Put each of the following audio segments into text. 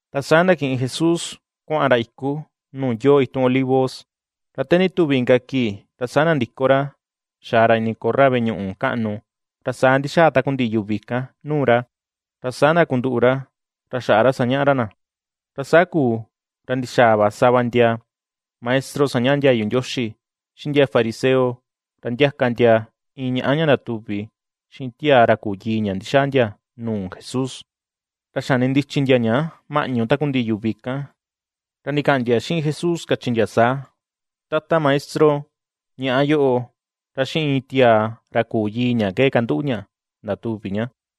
Ra saa ndakiꞌin Jesús kuaꞌan ra iku nuu yoo itun Olivos. Ra te ndituvi inka kii ra saa nandiko ra xaa ra ini korra veꞌe ñuꞌu kaꞌnu. Ra saa ndixaa takundiꞌi yuvi kan nuu ra, ra saa ndakunduꞌu ra, ra xaꞌa sañaꞌa ra na. Ra saa kuu ra ndixaa va sava ndia maestro sañaꞌa ndiayu Ndioxi, xiꞌin ndia fariseo, ra ndiaka ndia iin ñaꞌa ña ndatuvi xiꞌin tiaa ra küu yii ña ndixaa ndia nuu Jesús. Ra xani ndichi ndia ña maꞌñu takundiꞌi yuvi kan. Ra ndikaꞌan ndia xiꞌin Jesús kachi ndia saa: ―Tata Maestro, ñaꞌa yoꞌo ra xiꞌin iin tiaa ra küu yii ña ke kanduꞌu ña ndatuvi ña.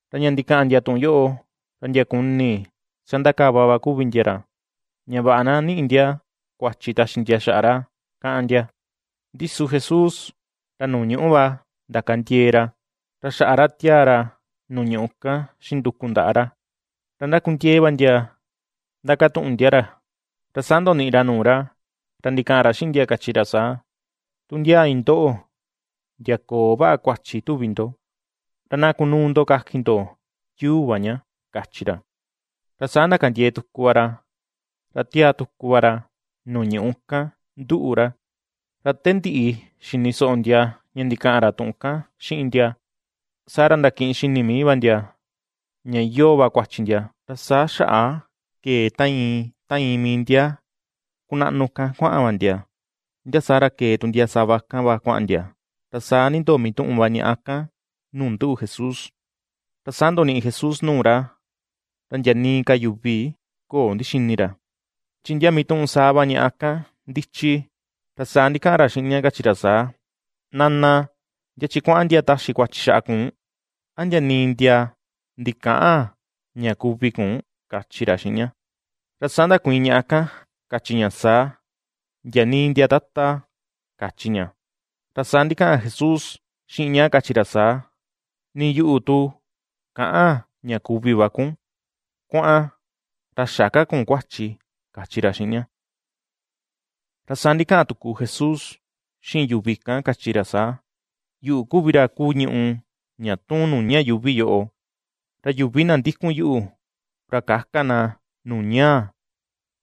Ra ña ndikaꞌan ndia tuꞌun yoꞌo, ra ndia kuni sandakava va ku vi ndia ra, ña vaꞌa na niꞌi ndia kuachi taxi ndia xaꞌa ra, káꞌán ndia. Ndi su Jesús ra nuu ñuꞌu va ndakandiee ra, ra xaꞌa ra tiaa ra nuu ñuꞌu kan xiꞌin nduku ndaꞌa ra. Ra ndakundiee va ndia ndakatuꞌun ndia ra, ra saa ndoniꞌi ra nuu ra, ra ndikaꞌan ra xiꞌin ndia kachi ra saa: ―Tu ndia iin ndoꞌo ndia köo vaꞌa kuachi tuvi ndo, ra na kunuu ndo kakin ndo yuu va ña ―kachi ra. Ra saa ndakandiee tuku va ra, ra tiaa tuku va ra nuu ñuꞌu kan nduꞌu ra. Ra te ndiꞌi xini soꞌo ndia ña ndikaꞌan ra tuꞌun kan xiꞌin ndia, saa ra ndakiꞌin xini mii va ndia ña iyoo va kuachi ndia, ra saa xaꞌa kee ta iin ta iin mii ndia kunaꞌnu kan kuaꞌan va ndia, ndia saa ra kee tu ndia sava kan va kuaꞌan ndia, ra saa nindoo mituꞌun va ñaꞌa kan nuu nduꞌu Jesús. Ra saa ndoniꞌi Jesús nuu ra, ra ndia nii ka yuvi köo ndixini ra, chi ndia mituꞌun saa va ñaꞌa kan ndichi, ra saa ndikaꞌan ra xiꞌin ña kachi ra saa: ―Nana, ¿ndia chi kuaꞌan ndia taxi kuachi xaꞌa kun? ¿A ndia nii ndia ndikäꞌan ña kuvi kun? ―kachi ra xiꞌin ña. Ra saa ndakuiin ñaꞌa kan kachi ña saa: ―Ndia nii ndia, Tata ―kachi ña. Ra saa ndikaꞌan Jesús xiꞌin ña kachi ra saa: ―Ni yuꞌu tu käꞌan ña kuvi va kun. Kuaꞌan ra xä ka kun kuachi ―kachi ra xiꞌin ña. Ra saa ndikaꞌan tuku Jesús xiꞌin yuvi kan, kachi ra saa: ―Yuꞌu kuvi ra kuu ñùꞌù ña tuun nuu ña yuuvi yoꞌo, ra yuvi na ndikun yuꞌu ra käka na nuu ñaa,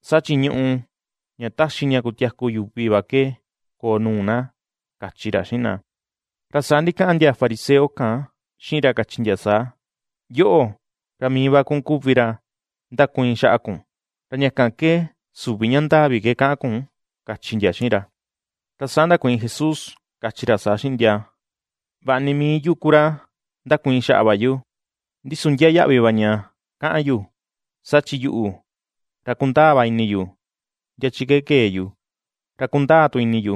saa chi ñùꞌù ña taxi ña kutiaku yuvi va ke koo nuu na ―kachi ra xiꞌin na. Ra saa ndikaꞌan ndia fariseo kan xiꞌin ra kachi ndia saa: ―Yoꞌo, ra mii va kun kuvi ra ndakuiin xaꞌa kun, ra ña kan ke süvi ña ndaa vi ke kaꞌan kun ―kachi ndia xiꞌin ra. Ra saa ndakuiin Jesús kachi ra saa xiꞌin ndia: ―Vaꞌa ni mii yu ku ra ndakuiin xaꞌa va yu, ndi su ndiaa yaꞌvi va ña kaꞌan yu. Saa chi yuꞌu ra kundaa va ini yu ndia chi ke kee yu, ra kundaa tu ini yu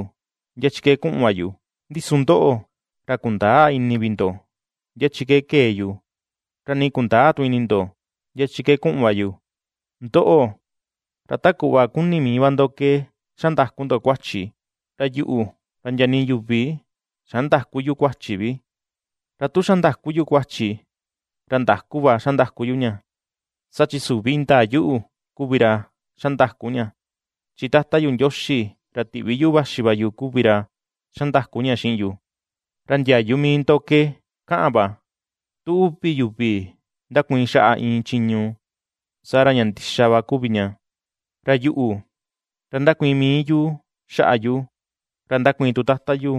ndia chi ke kuꞌun va yu; ndi su ndoꞌo ra kundäa ini vi ndo ndia chi ke kee yu, ra nii kundäa tu ini ndo ndia chi kuꞌun va yu. Ndoꞌo, ra ta kuꞌva kuni mii va ndo ke xa ndaku ndo kuachi, ra yuꞌu ra ndia nii yuvi xandäku yu kuachi vi. Ra tu xa ndaku yu kuachi, ra ndaku va xa ndaku yu ña, saa chi süvi indaa yuꞌu kuvi ra xa ndaku ña, chi Tata yu Ndioxi ra tiꞌvi yuꞌu vaxi va yu kuvi ra xa ndaku ña xiꞌin yu. Ra ndiayu mii ndo ke kaꞌan va, tu uvi yuvi ndakuiin xaꞌa iin chiñu, saa ra ña ndixa va kuvi ña. Ra yuꞌu ra ndakuiin mii yu xaꞌa yu, ra ndakuiin tu Tata yu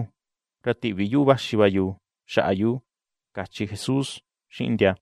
ra tiꞌvi yuꞌu vaxi va yu xaꞌa yu ―kachi Jesús xiꞌin ndia.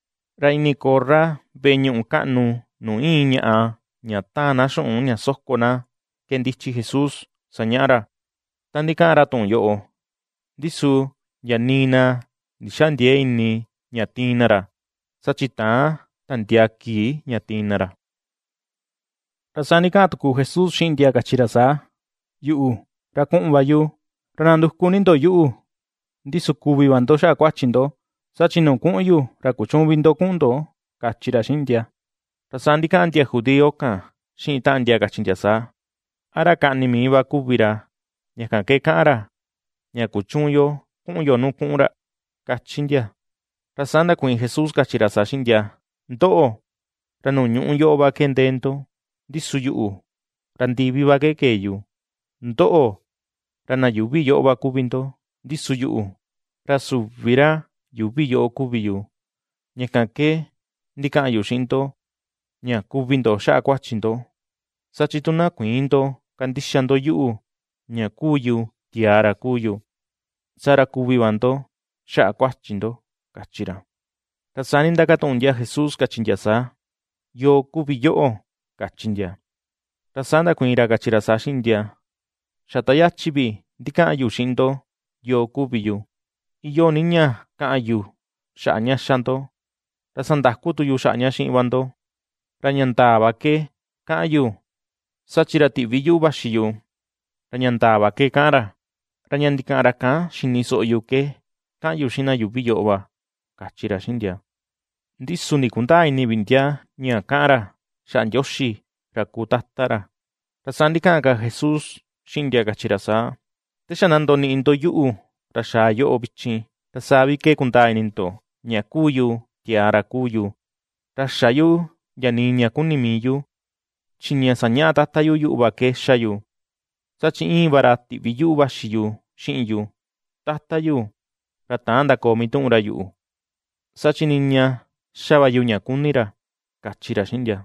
Ra ini korra veꞌe ñuꞌu kaꞌnu nuu íin ñaꞌa ña taan na xuꞌun ña soko na ke ndichi Jesús sañaꞌa ra, ta ndikaꞌan ra tuꞌun yoꞌo, ndi su ndia nii na ndixäa ndiee ini ña tiin na ra, saa chi täan tandiaa kii ña tiin na ra. Ra saa ndikaꞌan tuku Jesús xiꞌin ndia kachi ra saa: ―Yuꞌu, ra kuꞌun va yu, ra nanduku ni ndo yuꞌu, ndi su kuvi va ndo xaꞌa kuachi ndo, saa chi nuu kuꞌun yu, ra kuchüun vi ndo kuꞌun ndo ―kachi ra xiꞌin ndia. Ra saa ndikaꞌan ndia judío kan xiꞌin taꞌan ndia kachi ndia saa: ―¿A ra kaꞌni mii va kuvi ra, ña kan ke kaꞌan ra ña kuchüun yo kuꞌun yo nuu kuꞌun ra? ―kachi ndia. Ra saa ndakuiin Jesús kachi ra saa xiꞌin ndia: ―Ndoꞌo, ra nuu ñuꞌú yoꞌo va ke ndee ndo, ndi su yuꞌu, ra ndivi va kee yu; ndoꞌo, ra na yuuvi yoꞌo va kuvi ndo, ndi su yuꞌu, ra süvi ra yuuvi yoꞌo kuvi yu. Ña kan ke ndikaꞌan yu xiꞌin ndo ña kuvi ndo xaꞌa kuachi ndo, saa chi tu na kuïin ndo kandixa ndo yuꞌu ña ^kuu yu tiaa ra kuu yu, saa ra kuvi va ndo xaꞌa kuachi ndo ―kachi ra. Ra saa nindakatuꞌun ndia Jesús kachi ndia saa: ―¿Yoo kuvi yoꞌo? ―kachi ndia. Ra saa ndakuiin ra kachi ra saa xiꞌin ndia: ―Xa ta yachi vi ndikaꞌan yu xiꞌin ndo yoo kuvi yu. Iyoo ni ña kaꞌan yu xaꞌa ña ^xa ndo ra sandaku tu yu xaꞌa ña xiꞌin va ndo. Ra ña ndaa va ke kaꞌan yu saa chi ra tiꞌvi yuꞌu vaxi yu ra ña ndaa va ke kaꞌan ra, ra ña ndikaꞌan ra kan xini soꞌo yu ke, kaꞌan yu xiꞌin na yuuvi yoꞌo va ―kachi ra xiꞌin ndia. Ndi su ndikundäa ini vi ndia ña kaꞌan ra, xaꞌa Ndioxi ra kuu Tata ra. Ra saa ndikaꞌan ka Jesús xiꞌin ndia kachi ra saa: ―Te xa na ndoniꞌi ndo yuꞌu ra xaa yoꞌo vichin, ra saa vi ke kundaa ini ndo ña kuu yu tiaa ra kuu yu, ra xä yu ndia nii ña kuni mii yu, chi ña sañaꞌa Tata yu yuꞌu va ke ^xa yu. Saa chi íin va ra tiꞌvi yuꞌu vaxi yu xiꞌin yu; Tata yu ra täan ndakoo mituꞌun ra yuꞌu, saa chi niña xa va yu ña kuni ra ―kachi ra xiꞌin ndia.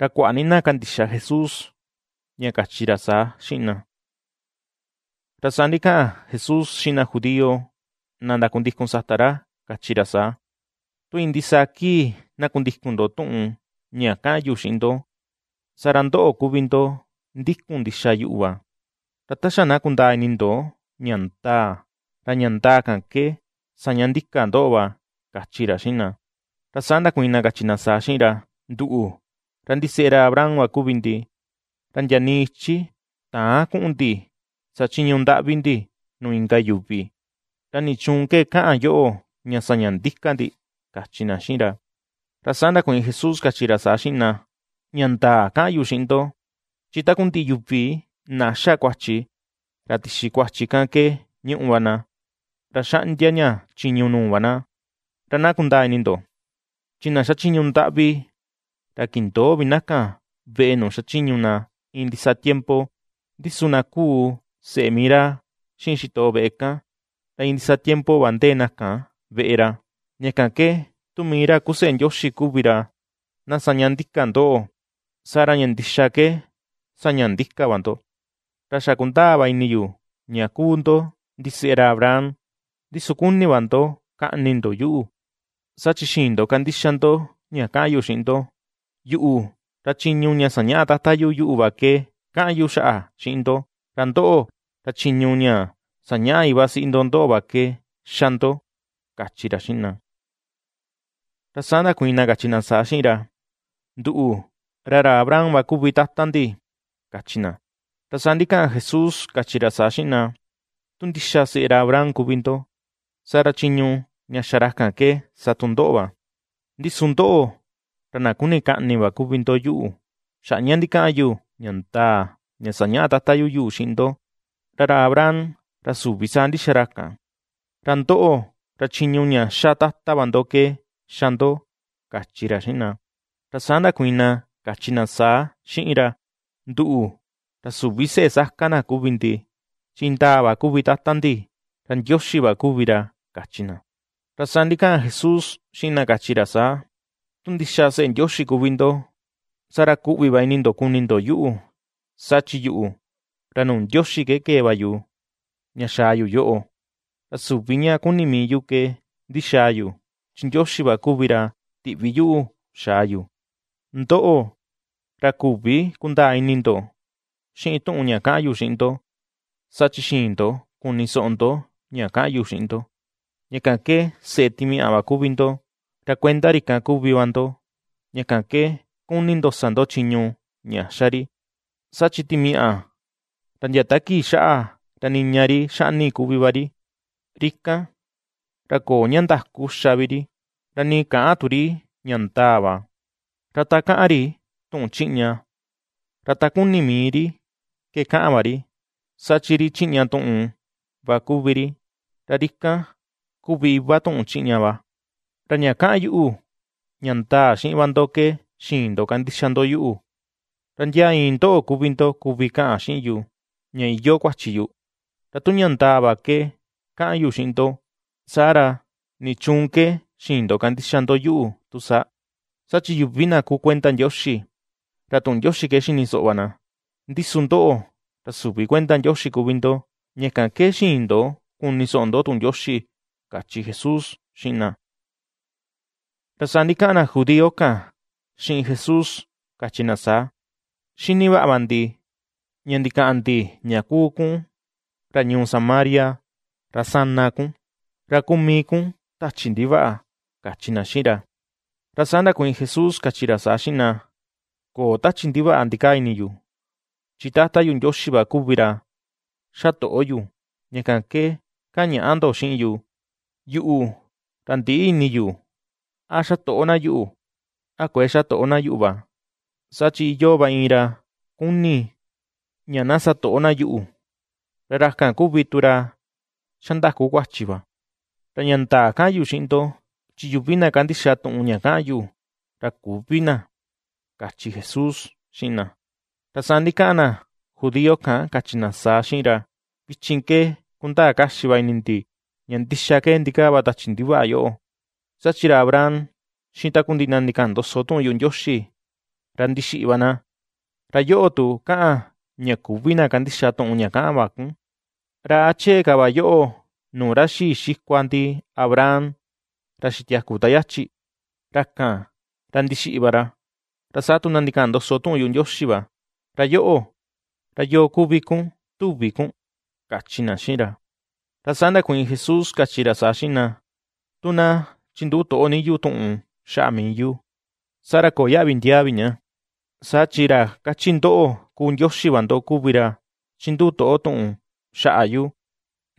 Ra kuaꞌa ni na kandixa Jesús, ña kachi ra saa xiꞌin na. Ra saa ndikaꞌan Jesús xiꞌin na judío na ndakundikun sata ra kachi ra saa: ―Tu iin ndisaa kii na kundikun ndo tuꞌun ña ^kaꞌan yu xiꞌin ndo, saa ra ndoꞌo kuvi ndo ndikun ndixa yuꞌu va. Ra ta xa na kundaa ini ndo ña ndaa, ra ña ndaa kan ke saña ndika ndoꞌo va ―kachi ra xiꞌin na. Ra saa ndakuiin na kachi na saa xiꞌin ra: ―Nduꞌu ra ndiseꞌe ra Abraham va kuvi ndi, ra ndia nii ichi täan kuꞌun ndi sa chiñu ndaꞌvi ndi nuu inka yuvi. ¿Ra nichuun ke kaꞌan yoꞌo ña saña ndika ndi? ―kachi na xiꞌin ra. Ra saa ndakuiin Jesús kachi ra saa xiꞌin na: ―Ña ndaa kaꞌan yu xiꞌin ndo, chi takundiꞌi yuvi na xa kuachi, ra tixi kuachi kan ke ñuꞌu va na, ra xaꞌndia ña chiñu nuu va na. Ra na kundaa ini ndo chi na xachiñu ndaꞌvi ra kindöo vi na kan veꞌe nuu xa chiñu na iin ndisaa tiempo, ndi su na kuu seꞌe mii ra xiꞌin xitoꞌo veꞌe kan, ra iin ndisaa tiempo va ndee na kan veꞌe ra. Ña kan ke, tu mii ra kuu Seꞌe Ndioxi kuvi ra na saña ndika ndoꞌo, saa ra ña ndixa ke saña ndika va ndo. Ra xa kundaa va ini yu ña kuu ndo ndiseꞌe ra Abraham, ndi su kuni va ndo kaꞌni ndo yuꞌu, saa chi xïin ndo kandixa ndo ña kaꞌan yu xiꞌin ndo. Yuꞌu, ra chiñu ña sañaꞌa Tata yu yuꞌu va ke kaꞌan yu xaꞌa xiꞌin ndo, ra ndoꞌo, ra chiñu ña sañaꞌa iva siꞌi ndo ndoꞌo va ke ^xa ndo ―kachi ra xiꞌin na. Ra saa ndakuiin na kachi na saa xiꞌin ra. ―Nduꞌu ra ra Abraham va kuvi Tata ndi ―kachi na. Ra saa ndikaꞌan Jesús kachi ra saa xiꞌin na: ―Tu ndixa seꞌe ra Abraham kuvi ndo, saa ra chiñu ña xa ra kan ke sa tu ndoꞌo va. Ndi su ndoꞌo, ra na kuni kaꞌni va kuvi ndo yuꞌu, xaꞌa ña ndikaꞌan yu ña ndaa ña sañaꞌa Tata yu yuꞌu xiꞌin ndo. ¡Ra ra Abraham, ra süvi saa ndixa ra kan! Ra ndoꞌo ra chiñu ña ^xa tata va va ndo ke ^xa ndo ―kachi ra xiꞌin na. Ra saa ndakuiin na kachi na saa xiꞌin ra: ―Nduꞌu, ra süvi seꞌe saka na kuvi ndi, chi indaa va kuvi Tata ndi, ra Ndioxi va kuvi ra ―kachi na. Ra saa ndikaꞌan Jesús xiꞌin na kachi ra saa: ―Tu ndixa seꞌe Ndioxi kuvi ndo, saa ra kuꞌvi va ini ndo kuni ndo yuꞌu, saa chi yuꞌu, ra nuu Ndioxi ke kee va yu ña xaa yu yoꞌo. Ra süvi ña kuni mii yu ke ndixaa yu, chi Ndioxi va kuvi ra tiꞌvi yuꞌu xaa yu. Ndoꞌo, ra küvi kundaa ini ndo xiꞌin tuꞌun ña kaꞌan yu xiꞌin ndo, saa chi xïin ndo kuni soꞌo ndo ña kaꞌan yu xiꞌin ndo. Ña kan ke seꞌe timiaꞌa va kuvi ndo, ra kuenda ri kan kuvi va ndo, ña kan ke kuni ndo sa ndo chiñu ña ^xa ri. Saa chi timiaꞌa, ra ndia ta kii xaꞌa ra niña ri xaꞌni kuvi va ri. Ri kan, ra köo ña ndaku ^xa vi ri, ra nii käꞌan tu ri ña ndaa va. Ra ta kaꞌan ri tuꞌun chiꞌña, ra ta kuni mii ri ke kaꞌan va ri; saa chi ri chiꞌña tuꞌun va kuvi ri, ra ri kan kuvi iva tuꞌun chiꞌña va. Ra ña kaꞌan yuꞌu, ña ndaa xiꞌin va ndo ke xïin ndo kandixa ndo yuꞌu. ¿Ra ndia iin ndoꞌo kuvi ndo kuvi kaꞌan xiꞌin yu, ña iyoo kuachi yu? Ra tu ña ndaa va ke kaꞌan yu xiꞌin ndo, saa ra, ¿nichuun ke xïin ndo kandixa ndo yuꞌu tu saa? Saa chi yuvi na kuu kuenda Ndioxi, ra tuꞌun Ndioxi ke ^xini soꞌo va na, ndi su ndoꞌo, ra süvi kuenda Ndioxi kuvi ndo ña kan ke xïin ndo kuni soꞌo ndo tuꞌun Ndioxi ―kachi Jesús xiꞌin na. Ra saa ndikaꞌan na judío kan xiꞌin Jesús kachi na saa: ―Xini vaꞌa va ndi ña ndikaꞌan ndi ña kuu kun ra ñuu Samaria, ra sana kun, ra kuu mii kun tachi ndivaꞌa ―kachi na xiꞌin ra. Ra saa ndakuiin Jesús kachi ra saa xiꞌin na: ―Köo tachi ndivaꞌa ndikaa ini yu, chi Tata yu Ndioxi va kuvi ra xa toꞌo yu, ña kan ke kaꞌan ñaꞌa ndo xiꞌin yu. Yuꞌu, ra ndïꞌi ini yu a xa toꞌo na yuꞌu a kuëe xa toꞌo na yuꞌu va, saa chi iyoo va iin ra kuni ña na sa toꞌo na yuꞌu, ra ra kan kuvi tu ra xandaku kuachi va. Ra ña ndaa kaꞌan yu xiꞌin ndo, chi yuvi na kandixa tuꞌun ña kaꞌan yu, ra küvi na ―kachi Jesús xiꞌin na. Ra saa ndikaꞌan na judío kan kachi na saa xiꞌin ra: ―Vichin ke ^kundaa kaxi va ini ndi ña ndixa ke ndikaa va tachi ndivaꞌa yoꞌo, saa chi ra Abraham xiꞌin takundiꞌi na ndikaꞌan ndoso tuꞌun yuꞌu Ndioxi, ra ndixiꞌi va na. Ra yoꞌo tu kaꞌan, ña küvi na kandixa tuꞌun ña kaꞌan va kun. ¿Ra a chee ka va yoꞌo nuu ra xii xikua ndi Abraham ra xitiaku ta yachi? Ra kan ra ndixiꞌi va ra, ra saa tu na ndikaꞌan ndoso tuꞌun yuꞌu Ndioxi va. ¿Ra yoꞌo, ra yoo kuvi kun tuvi kun? ―kachi na xiꞌin ra. Ra saa ndakuiin Jesús kachi ra saa xiꞌin na: ―Tu na chinduꞌu toꞌo ni yu tuꞌun xaꞌa mii yu, saa ra köo yaꞌvi ndiaa vi ña. Saa chi ra kachi ndoꞌo kuu Ndioxi va ndo kuvi ra chinduꞌu toꞌo tuꞌun xaꞌa yu.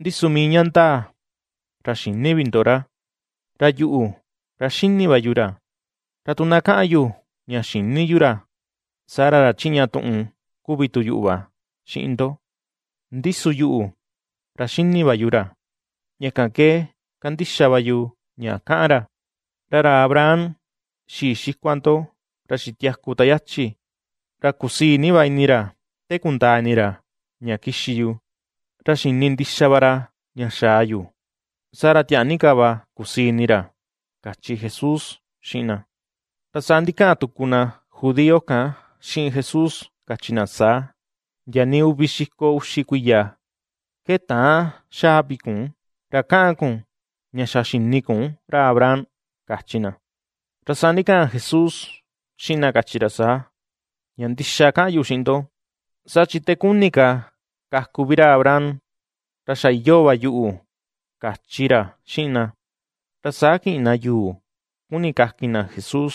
Ndi su mii ña ndaa ra xïni vi ndo ra. Ra yuꞌu, ra xini va yu ra. Ra tu na kaꞌan yu ña xïni yu ra, saa ra ra chiꞌña tuꞌun kuvi tu yuꞌu va xiꞌin ndo. Ndi su yuꞌu, ra xini va yu ra ña kan ke kandixa va yu ña kaꞌan ra. Ra ra Abraham xii xikua ndo ra xitiaku ta yachi, ra kusii ni va ini ra te kundaa ini ra ña kixi yu; ra xini ndixa va ra ña xaa yu, saa ra tiaa ni ka va kusii ini ra ―kachi Jesús xiꞌin na. Ra saa ndikaꞌan tuku na judío kan xiꞌin Jesús kachi na saa: ―Ndia nii uvi xiko uxi kuiya ke täan xaa vi kun, ¿ra kaꞌan kun ña xa xini kun ra Abraham? ―kachi na. Ra saa ndikaꞌan Jesús xiꞌin na kachi ra saa: ―Ña ndixa ke kaꞌan yu xiꞌin ndo, saa chi te kuni ka kaku vi ra Abraham ra xa iyoo va yuꞌu ―kachi ra xiꞌin na. Ra saa kiꞌin na yuu kuni kakin na Jesús;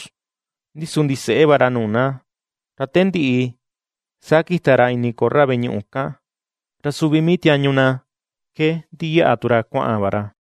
ndi su ndiseꞌe va ra nuu na, ra te ndiꞌi saa kita ra ini korra veꞌe ñuꞌu kan, ra suvi mii tiañu na ke ndiyaꞌa tu ra kuaꞌan va ra.